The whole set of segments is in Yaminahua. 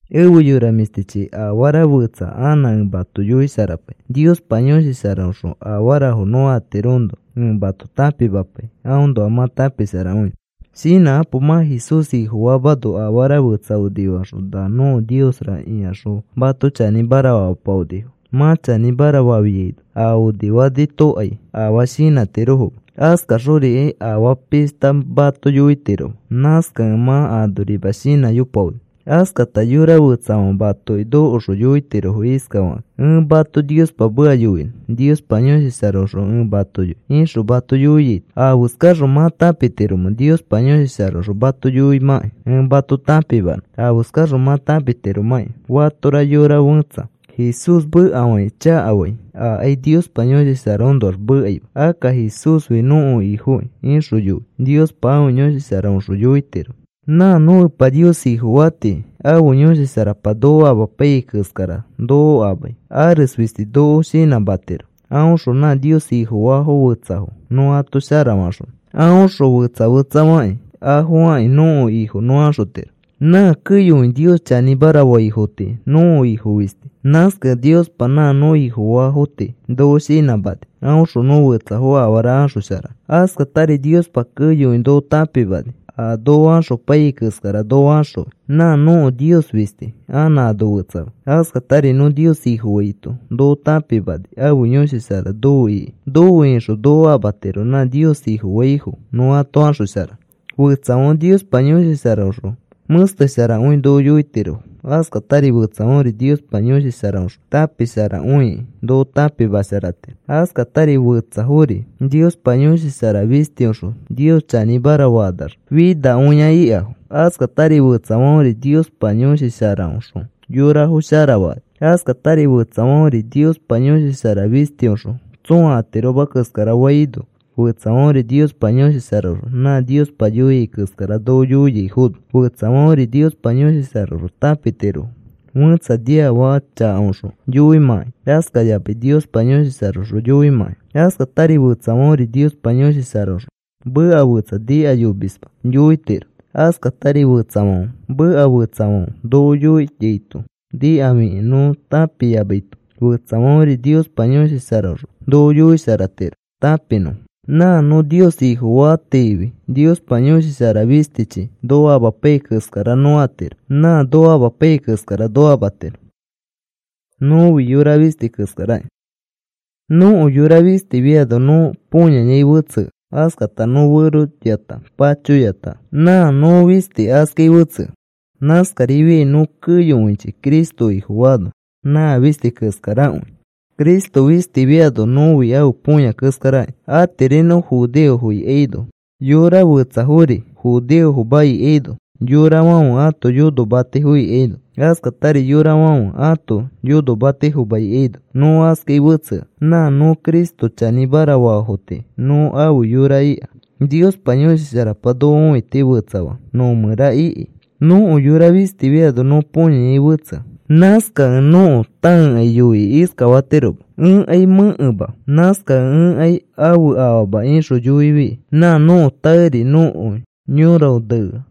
Efe yora mĩshtichi, afara fetsa anã ẽ mato yoisharapai. Niospa Yõshi Sharaõxõ afarafo nõ atiroõnoa ẽ mato tãpimapai aõnoa mã tãpisharakõinõ. Shinãkapo. Mã Jesús Ifofaamano afara fetsa onifakaxõ, “Na nõko niosra,” ikaxõ mato chanĩmara famapaonifo. Mã chanĩmara fafiaino a onifafotokai afaa shinãtirofoma. Askaxorikai afaa pishta mato yoitiroma. Nãskakẽ mã anorima shinãyopaoni. Askata yora fetsafãfe matoki nokoxõ yoitirofo iskafakakĩ: “Ẽ mato Niospa meka yoinõ. Niospa Yõshi Sharaõxõ ẽ mato yoi,” ixõ mato yoiaito, ¿afeskaxõ mã tãpitiromẽ Niospa Yõshi Sharaõxõ mato yoimãkĩ? Ẽ mato tãpimanõ afeskaxõ mã tãpitiromãkĩ. Fatora yora fẽtsa Jesús mekafakĩ chakafai, akai Niospa Yõshi Sharaõnoax mekaima. Akka, “Jesúsfi nõko Ifokĩ,” ixõ yoi Niospa ãfe Yõshi Sharaõxõ yoitiro. Nã nõ Epa Nios Ifofa tii ãfe Yõshi Sharapa noko amapaiyai keskara noko amai. Ares fisti noko shinãmatiro aõxõ nã Nios Ifofaafo fetsafo nõ ato asharaxonõ. Aõxõ fetsa fetsafakĩ afo akĩ nõko Ifo nõ axotiro. Nã keyokõi Nios chanĩmara faifo tii nõko Ifo fisti. Nãskakẽ Niospa nã nõ Ifofa tii noko shinãmani aõxõ nõ fetsafo afara axosharanõ. Askatari Niospa keyokõi noko tãpimani a noko axopaiyai keskara noko axõi. Nã nõko Nios fisti anã ano fetsama. Askatari nõ Nios Ifofaito noko tãpimani ãfe Yõshi Shara nofe iki. Nofe ixõ noko amatiro nã Nios Ifofaifo nõ ato axosharanõ. Fetsafãfe Niospa Yõshi Sharaõxõ mẽstesharakõi noko yoitiro. Askatari fetsafãfe Niospa Yõshi Sharaõxõ tãpisharakõikĩ noko tãpimasharatiro. Askatari fetsafori Niospa Yõshi Shara fistiõxõ Nios chanĩmara fakanax finakõia ikafo. Askatari fetsafãferi Niospa Yõshi Sharaõxõ yorafo sharafakani. Askatari fetsafãferi Niospa Yõshi Shara fistiõxõ tsõa atiroma keskara faino, fetsafãferi Niospa Yõshi Sharaõxõ nã Niospa yoiai keskara noko yoiaifono, fetsafãferi Niospa Yõshi Sharaõxõ tãpitiro fẽtsa niafaka chakaõxõ yoimãkai askayamai Niospa Yõshi Sharaõxõ yoimãkai. Askatari fetsafãferi Niospa Yõshi Sharaõxõ meka fetsa nikayomisma yoitiro. Askatari fetsafãfe meka fetsafãfe noko yoiaito nikafikĩ nõ tãpiyamaito fetsafãferi Niospa Yõshi Sharaõxõ noko yoisharatiro tãpinõfo. Nã nõ Nios Ifofatifi Niospa Yõshi Shara fistichi noko amapaiyai keskara nõ atiro. Nã noko amapaiyai keskara noko amatiro. Nõko yora fistifiano nõ põyayai fetsea. Askata nõ feroyata, pachoyata nã nõ fisti askai fetsea. Nãskarifiai nõ keyokõichi Cristo Ifofaano nã fisti keskarakõi. Cristo fistifiano nõfi ãfe põya keskarakĩ. Atiri nõ judeofo ikaino mani fetsafori judeofoma ikaino yorafãfe ãto yonomatifo ikaino askatari yorafãfe ãto yonomatifoma ikaino nõ askai fetsea. Nã nõ Cristo chanĩmara faafo tii nõ afe yora ika. Niospa Yõshi Sharapa noko õiti fetsafaax nõ mẽra iki. Nõko yora fistifiano nõ põyayai fetsea. Nãskakẽ nõko tãekai yoikĩ iskafatiroma: “Ẽkai mẽkema. Nãskakẽ ẽkai ãfe afaama,” ixõ yoifi nã nõko tãeri nõko yoraõ nea.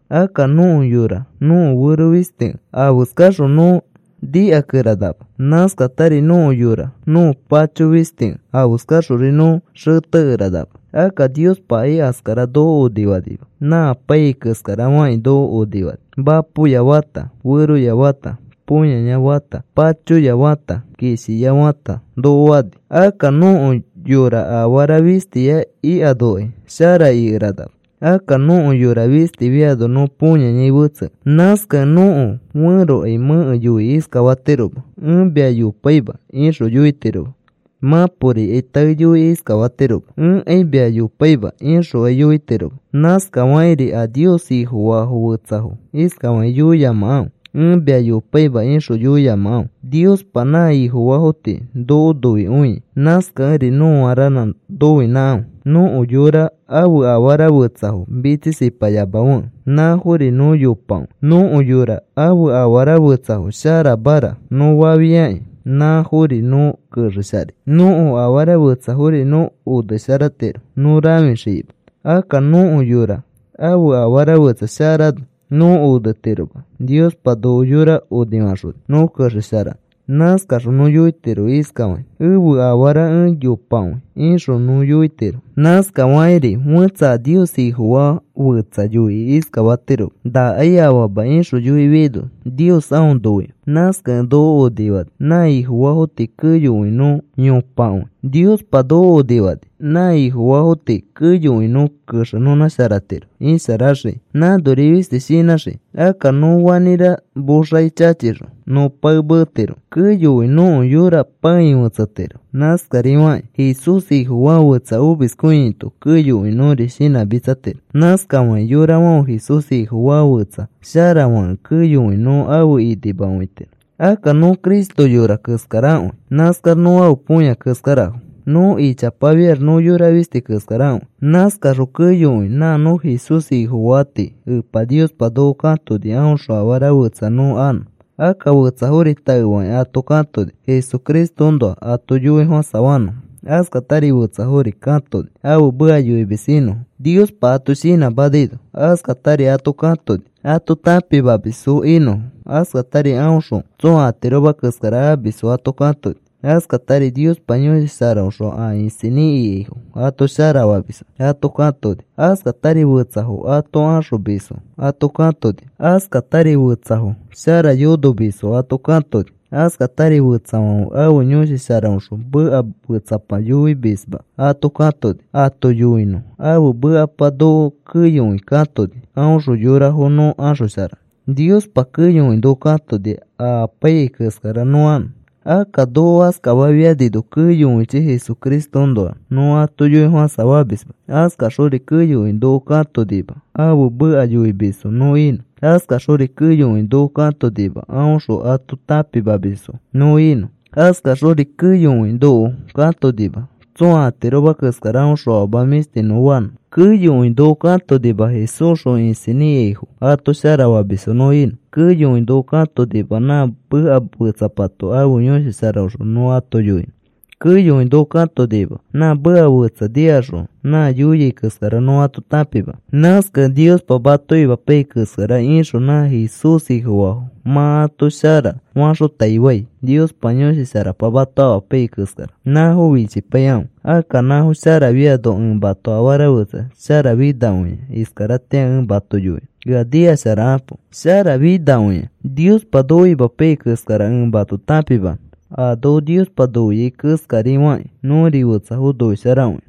Akka nõko yora nõko fero fistikẽ afeskaxõ nõ nikakeranama. Nãskatari nõko yora nõko pacho fistikẽ afeskaxori nõ xetekeranama. Akka Niospakai askara noko onifanima. Nã apaiyai keskara fakĩ noko onifani. Mapoya fãta feroya fãta põyaya fãta pachoya fata kishiya fãta noko fani. Akka nõko yora afara fistiya ikanokai shara ikeranama. Akka nõko yora fistifiano nõ põyayai fetsea. Nãskakẽ nõko fẽrokai mẽke yoikĩ iskafatiroma: “Ẽ mia yopaima,” ixõ yoitiroma. Mãporikai tae yoikĩ iskafatiroma: “Ẽkai mia yopaima,” ixokai yoitiroma. Nãskafakĩri a Nios Ifofaa fetsafo iskafakĩ yoiyamakãfe: “Ẽ mia yopaima,” ixõ yoiyamakãfe. Niospa nã Ifofaafo tii noko noikõia. Nãskakẽri nõa ranã noinãkãfe. Nõko yora ãfe afara fetsafo mitsisipayamafekẽ nãfori nõ yopakõi. Nõko yora ãfe afara fetsafo, sharamara, nõ fafiakĩ nãfori nõ kexesharai. Nõko afara fetsafori nõ onesharatiro nõ rãfixikĩma. Akka nõko yora ãfe afara fetsa sharano nõ onetiroma. Niospa noko yora onifaxoni nõ kexesharanõ. Nãskaxõ nõ yoitiro iskafakĩ: “Ẽfe afara ẽ yopakõi,” ixõ nõ yoitiro. Nãskafakiri fẽtsa a Nios Ifofaa fetsa yoikĩ iskafatiroma: “Nakai afama,” ixõ yoifiaino Nios aõ noikõi. Nãskakẽ noko onifani nã Ifofaafo tii keyokõi nõ yopakõi. Niospa noko onifani nã Ifofaafo tii keyokõi nõ kexenõnãsharatiro isharaxikĩ nãnori fisti shinãxikĩ. Akka nõ fanĩra moxaki chachixõ nõ pae meetiro keyokõi nõko yora pãei fetsetiro. Nãskarifakĩ Jesús Ifofaa fetsa omiskõiaito keyokõi nõri shinãmitsatiro. Nãskafakĩ yorafãfe Jesús Ifofaa fetsa sharafakẽ keyokõi nõ afe inimakõitiro. Akka nõ Cristo yora keskarakõi. Nãskax nõ ãfe põya keskarafo. Nõ ichapafiax nõ yora fisti keskarakõi. Nãskaxõ keyokõi nã nõ Jesús Ifofaa tii Epa Niospa noko katoni aõxõ afara fetsa nõ anõ. Akka fetsafori taefakĩ ato katoni Jesucristoõnoa ato yoifofãsafanõfo. Askatari fetsafori katoni ãfe meka yoimis inõfo Niospa ato shinãmanaino. Askatari ato katoni ato tãpimamisfo inõfo. Askatari aõxõ tsõa atiroma keskara amisfo ato katoni. Askatari Niospa Yõshi Sharaõxõ a isinĩ ikaifo ato sharafamisfo ato katoni. Askatari fetsafo ato axomisfo ato katoni. Askatari fetsafo shara yonomamisfo ato katoni. Askatari fetsafãfe ãfe Yõshi Sharaõxõ meka fetsapa yoiyomisma ato katoni ato yoinõ ãfe mekapa. Noko keyokõi katoni aõxõ yorafo nõ axosharanõ. Niospa keyokõi noko katoni a apaiyai keskara nõ anõ. Akka noko askafafianino keyokõichi Jesucristoõnoa nõ ato yoifofãsafamisma. Askaxori keyokõi noko katonima ãfe meka yoimisfo nõ inõ. Askaxori keyokõi noko katonima aõxõ ato tãpimamisfo nõ inõ. Askaxori keyokõi noko katonima tsõa atiroma keskara aõxõ afama mĩshti nõ fanõ. Keyokõi noko katonima Jesúsxõ isinĩ ikaifo ato sharafamisfo nõ inõ. Keyokõi noko katonima nã meka fetsapato ãfe Yõshi Sharaõxõ nõ ato yoinõ. Keyokõi noko katonima nã meka fetsa nikaxõ nã yoia keskara nõ ato tãpimanõ. Nãskakẽ Niospa mato imapaiyai keskara ixõ nã Jesús Ifofaafo mã ato shara faxotaifai. Niospa Yõshi Sharapa mato amapaiyai keskara nãfo fichipaikãfe. Akka nãfo sharafiano ẽ mato afara fetsa sharafinakõia iskaratĩa ẽ mato yoinõ. Ea nikasharakapo. Shara finakõia Niospa noko imapaiyai keskara ẽ mato tãpimanõ, a noko Niospa noiai keskari fakĩ nõri fetsafo noisharakõinõ.